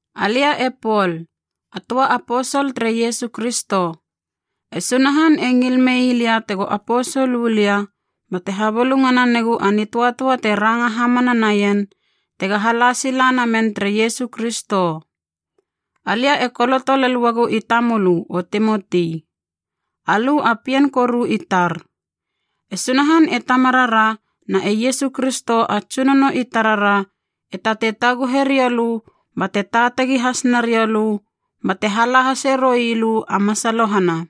Alia e Pol, a töa aposol tere Iesu Kristo. E Sunahan e ngil mei lia tego aposol u lia bate habulungana negu a nitöatöa te ranga hamana naien tega hala sila namen tere Iesu Kristo. Alia e koloto lel uagu i tamölö, o Timoti. Alö a pien koru i tar. E Sunahan e Tamarara na e Iesu Kristo a Tsunono i tarara e tatei taguhe rioulö bate taatagi has nariou lö bate hala hase roilö a masalohana.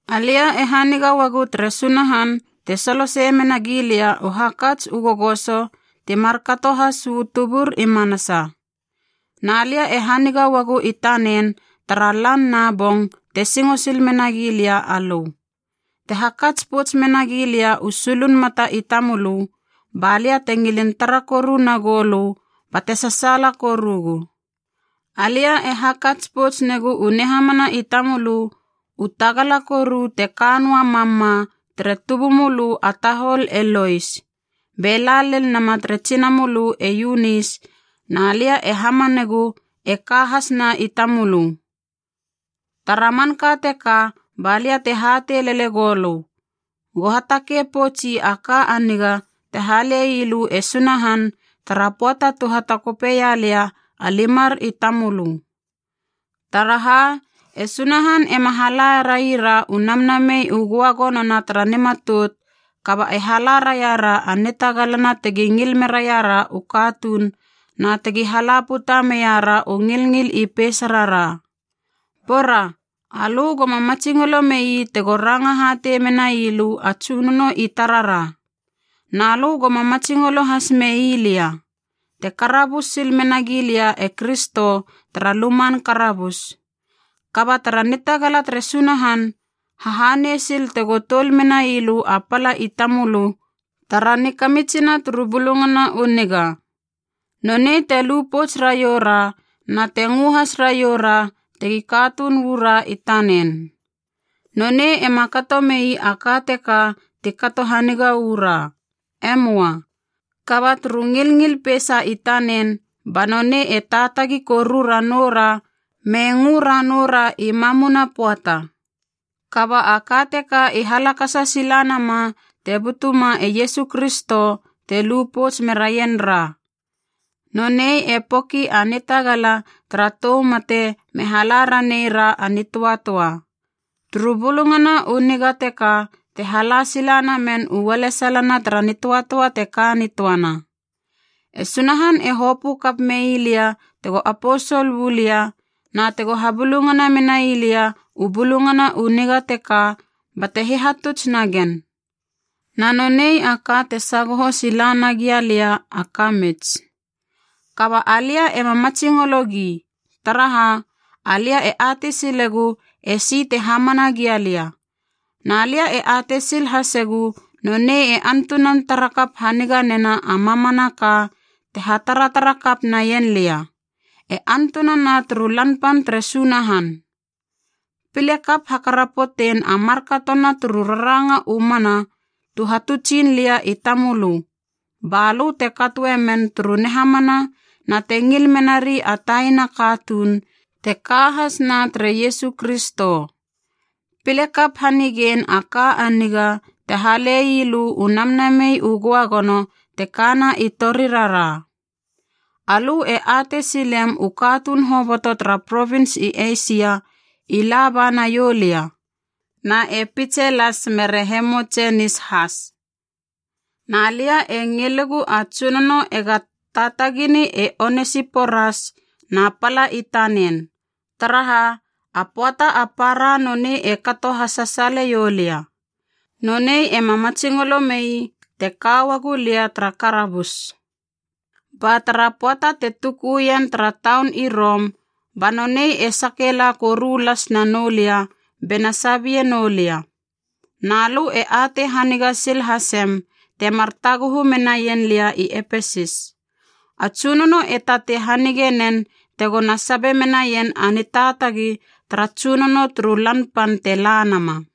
Alia e haniga uagu tere Sunahan te solosei mena gilia u hakats u gogoso ti markato has uu tubur i manasa. Na lia e haniga uagu i tanen tara lan na bong te singo sil menagi lia alö. Te hakats pouts menagi lia u sulun mata i tamölö, ba lia te ngilin tara koru nagou lö bate sasaala korugu. Alia e hakats pouts negu u nihamana i tamölö u tagala koru te ka noa mam ma tere tubumölö a tahol e Lois, be la lel nama tere tsinamölö e Eunis na lia e hamanegu e ka has na i tamölö. Tara manka teka ba lia te hatei lele goulö, go hatakei poutsi a ka a niga te hale ii lö e Sunahan tara pöata tu hatakopeia lia a limar i tamölö. Taraha, e Sunahan ema hala raira u Namnamei u Göagonona tara nimatout, kaba e hala raira a nitagalana tegi ngil meraira u katuun na tegi hala puta meira u ngilngil i peisarara. Bora, alö goma matsingolo mei tego ranga hatei menailö a Tsunono i tarara. Na lö goma matsingolo has mei lia, te karabus sil menagi lia e Kristo tara luman karabus. Kaba tara nitagala tere Sunahan, hahanei sil tego toul menailö a pala i tamölö tara nikamitsina turu Bulungana u Niga. Nonei te lu pouts raiou ra na te ngö has raioura tegi katuun uu ra i tanen. Nonei ema kato mei a ka teka ti kato haniga uu ra. Emoa, kaba turu ngilngil peisa i tanen ba nonei e taatagi koru ranoura me ngö ranoura i mamuna pöata. Kaba a ka teka i halakasa sila nama te butuma e Iesu Kristo te lu pouts meraien ra. Nonei e poki a nitagala tara tou mate me hala raneira a nitöatöa. Turu Bulungana u Niga teka te hala sila namen u ualesalana tara nitöatöa te ka nitöana. E Sunahan e hopö kap mei lia tego aposol uu lia na tego habulungana menai lia u Bulungana u Niga teka bate hihatuts nagen. Na nonei a ka te sagoho sila nagia lia a kamits. Kaba alia ema matsingologi, taraha, alia e atei silegu esi te hamana gia lia, na lia e atei sil hasegu nonei e antunan tara kap haniga nena a mamanaka te hataratara kap naien lia, e antunana turu Lan Pan tere Sunahan. Pile kap hakarapotein a markatona turu raranga u mana tu hatutsin lia i tamölö, balö te katoe men turu nihamana na te ngil menari a taina katuun te ka has na tere Iesu Kristo. Pile kap hanigein a ka a niga te hale ii lö u Namnamei u Göagono te kana i torirara. Alö e atei silem u katuun hoboto tara provins i Eisia i la ba naiou lia, na e Pitselas mere Hemotsenis has. Na lia e ngilegu a Tsunono ega taatagini e Onesiporas na pala i tanen, taraha, a pöata a para nonei e kato hasasaaleiou lia. Nonei ema matsingolo mei te ka uagu lia tara karabus. Ba tara pöata te tukuien tara taun i Rom, ba nonei e sake la koru las na noulia bena sabie noulia. Na lö e atei haniga sil hasem temar taguhu menaien lia i Epesis. A Tsunono e tatei hanige nen tegona sabe menaien a nitaatagi tara Tsunono turu Lan Pan te la nama.